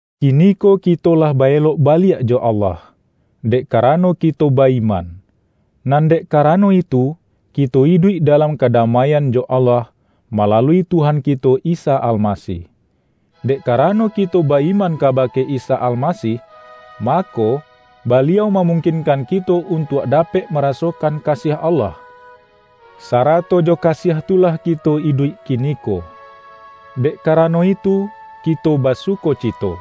Kiniko kito lah ba-elok baliak jo Allah, dek karano kito ba-iman. Nan dek karano itu, kito iduik dalam kadamaian jo Allah, malalui Tuhan kito Isa Almasih. Dek karano kito ba-iman kabake Isa Almasih, mako, Baliau mamungkinkan kito untuak dapek marasokan kasiah Allah, sarato jo kasiah tu lah kito iduik kiniko. Dek karano itu kito basukocito,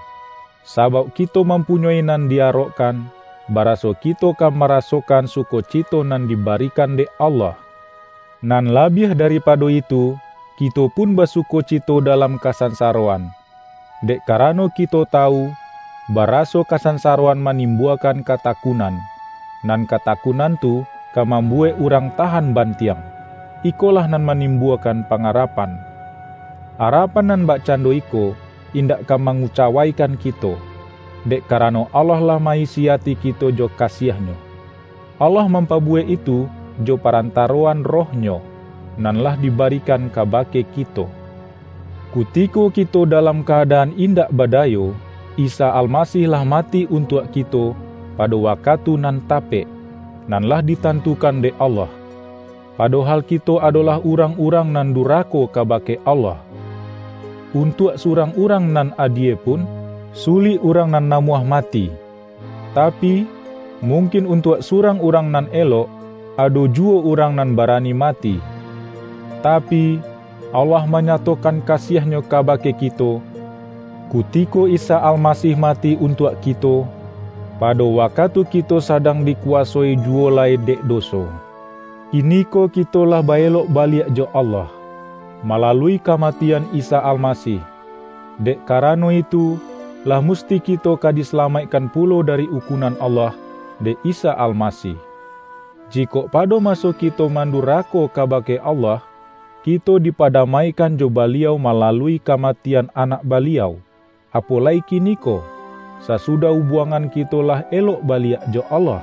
sabauk kito mampunyoi nan di-arokkan, baraso kito ka marasokan sukocito nan dibarikan dek Allah! Nan labiah daripado itu, kito pun basukocito dalam kasansaroan, dek karano kito tawu, baraso kasansaroan manimbuakan katakunan, nan katakunan tu ka mambuwek urang tahan bantiang; ikolah nan manimbuakan pangarapan. Arapan nan bakcando iko, indak ka mangucawaikan kito, dek karano Allah lah ma-isi ati kito jo kasiah-Nyo. Allah mampabuwek itu jo parantaroan Roh-Nyo, nan lah dibarikan kabake kito. Kutiko kito dalam ka-adaan indak badayo, Isa Almasih lah mati untuak kito pado wakatu nan tapek, nan lah ditantukan dek Allah; padohal kito adolah urang-urang nan durako kabake Allah. Untuak surang urang nan adie pun, sulik urang nan namuah mati. Tapi, mungkin untuak surang urang nan elok, ado juwo urang nan barani mati. Tapi, Allah manyatokan kasiah-Nyo kabake kito, kutiko Isa Almasih mati untuak kito, pado wakatu kito sadang dikuwasoi juwo lai dek doso. Kiniko kito lah ba-elok baliak jo Allah, malalui kamatian Isa Almasih; dek karano itu, lah musti kito ka disalamaikkan pulo dari ukunan Allah, dek Isa Almasih. Jikok pado maso kito mandurako kabake Allah, kito dipadamaikan jo Baliau malalui kamatian Anak Baliau, apo lai kiniko, sasudah ubuangan kito lah elok baliak jo Allah,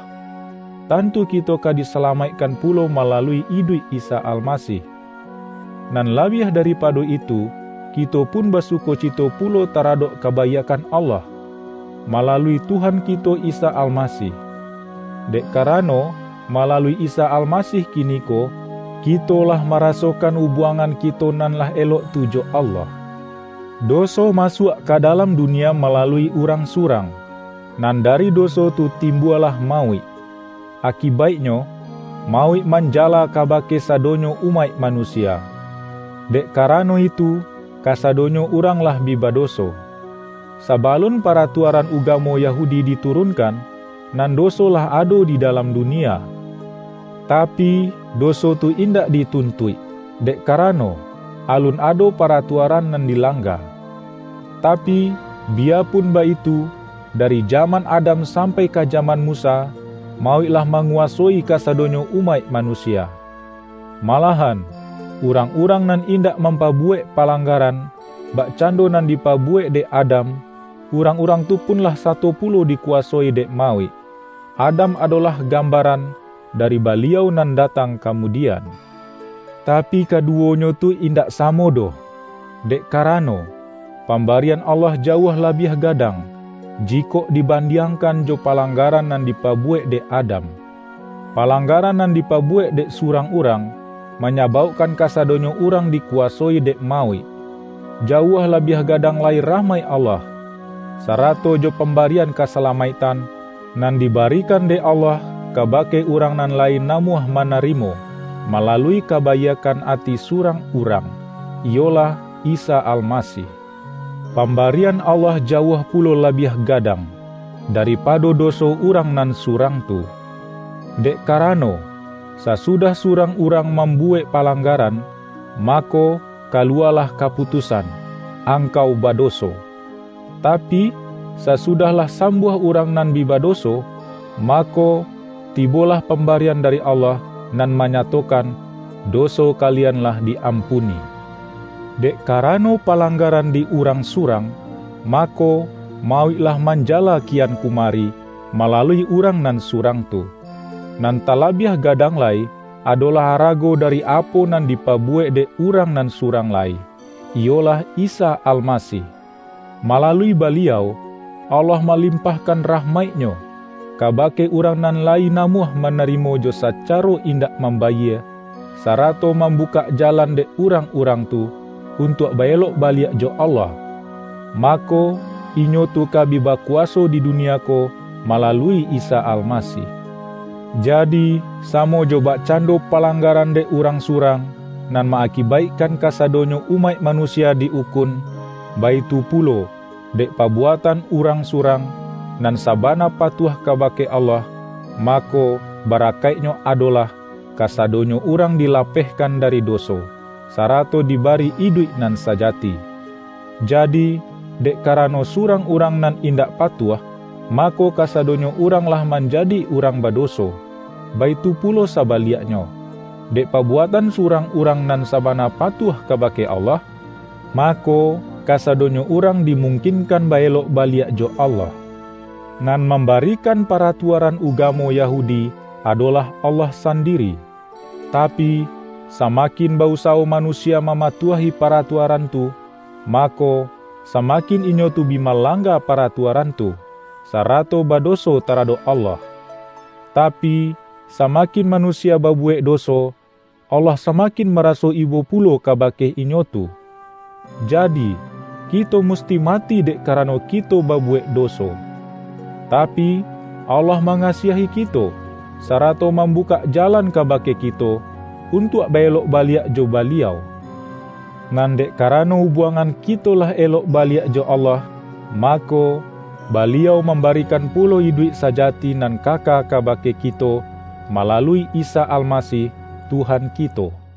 tantu kito ka disalamaikkan pulo malalui iduik Isa Almasih. Nan labiah daripado itu, kito pun basukocito pulo taradok kabaiakkan Allah, malalui Tuhan kito Isa Almasih. Dek karano, malalui Isa Almasih kiniko kito lah marasokan ubuangan kito nan lah elok tu jo Allah. Doso masuak ka dalam dunia malalui urang surang, nan dari doso tu timbualah mauik. Akibaiknyo, mauik manjala kabake sadonyo umaik manusia, dek karano itu, kasadonyo urang lah bi badoso. Sabalun paratuaran ugamo Yahudi diturunkan, nan doso lah ado di dalam dunia. Tapi, doso tu indak dituntuik, dek karano, alun ado paratuaran nan dilangga. Tapi, biyapun baitu, dari jaman Adam sampai ka jaman Musa, mauik lah manguwasoi kasadonyo umaik manusia. Malahan, urang-urang nan indak mampabuwek palanggaran, bakcando nan dipabuwek dek Adam, urang-urang tu pun lah sato pulo dikuwasoi dek mauik. Adam adolah gambaran, dari Baliau nan datang kamudian. Tapi, kaduwonyo tu indak samo doh; dek karano, pambarian Allah jauah labiah gadang, jikok dibandiangkan jo palanggaran nan dipabuwek dek Adam. Palanggaran nan dipabuwek dek surang urang, manyabaukkan kasadonyo urang dikuwasoi dek mauik. Jauah labiah gadang lai rahmaik Allah, sarato jo pambarian kasalamaiktan, nan dibarikan dek Allah kabake urang nan lai namuah manarimo, malalui kabaiakkan ati surang Urang, iyolah Isa Almasih. Pambarian Allah jauah pulo labiah gadang, daripado doso urang nan surang tu. Dek karano, sasudah surang urang mambuwek palanggaran, mako, kaluwalah kaputusan,”Angkau badoso”. Tapi, sasudah lah sambuah urang nan bi badoso, mako, tibolah pambarian dari Allah, nan manyatokan,”Doso kalian lah di-ampuni”. Dek karano palanggaran di urang surang, mako, mauik lah manjala kian kumari, malalui urang nan surang tu. Nan talabiah gadang lai, adolah arago dari apo nan dipabuwek dek Urang nan surang lai, iyolah Isa Almasih. Malalui Baliau, Allah malimpahkan rahmaik-Nyo, kabake urang nan layi namuah manarimo jo sacaro indak mambayie, sarato mambukak jalan dek urang-urang tu, untuak ba-elok baliak jo Allah; mako, inyo tu ka bi bakuwaso di dunia ko, malalui Isa Almasih. Jadi, samo jo bakcando palanggaran dek urang surang, nan ma-akibaikkan kasadonyo umaik manusia di-ukun, baitu pulo, dek pabuatan Urang surang, nan sabana patuah kabake Allah, mako, barakaiknyo adolah, kasadonyo urang dilapehkan dari doso, sarato dibari iduik nan sajati. Jadi, dek karano surang urang nan indak patuah, mako, kasadonyo urang lah manjadi urang badoso, baitu pulo sabaliaknyo, dek pabuatan surang Urang nan sabana patuah kabake Allah, mako, kasadonyo urang dimungkinkan ba-elok baliak jo Allah. Nan mambarikan paratuaran ugamo Yahudi, adolah Allah sandiri. Tapi, samakin ba-usawo manusia mamatuahi paratuaran tu, mako, samakin inyo tu bi malangga paratuaran tu, sarato badoso taradok Allah. Tapi, samakin manusia babuwek doso, Allah samakin maraso ibo pulo kabake inyo tu. Jadi, kito musti mati dek karano kito babuwek doso. Tapi, Allah mangasiahi kito, sarato mambukak jalan kabake kito, untuak ba-elok baliak jo Baliau. Nan dek karano ubuangan kito lah elok baliak jo Allah, mako, Baliau mambarikan pulo iduik sajati nan kaka kabake kito, malalui Isa Almasih, Tuhan kito. ROMA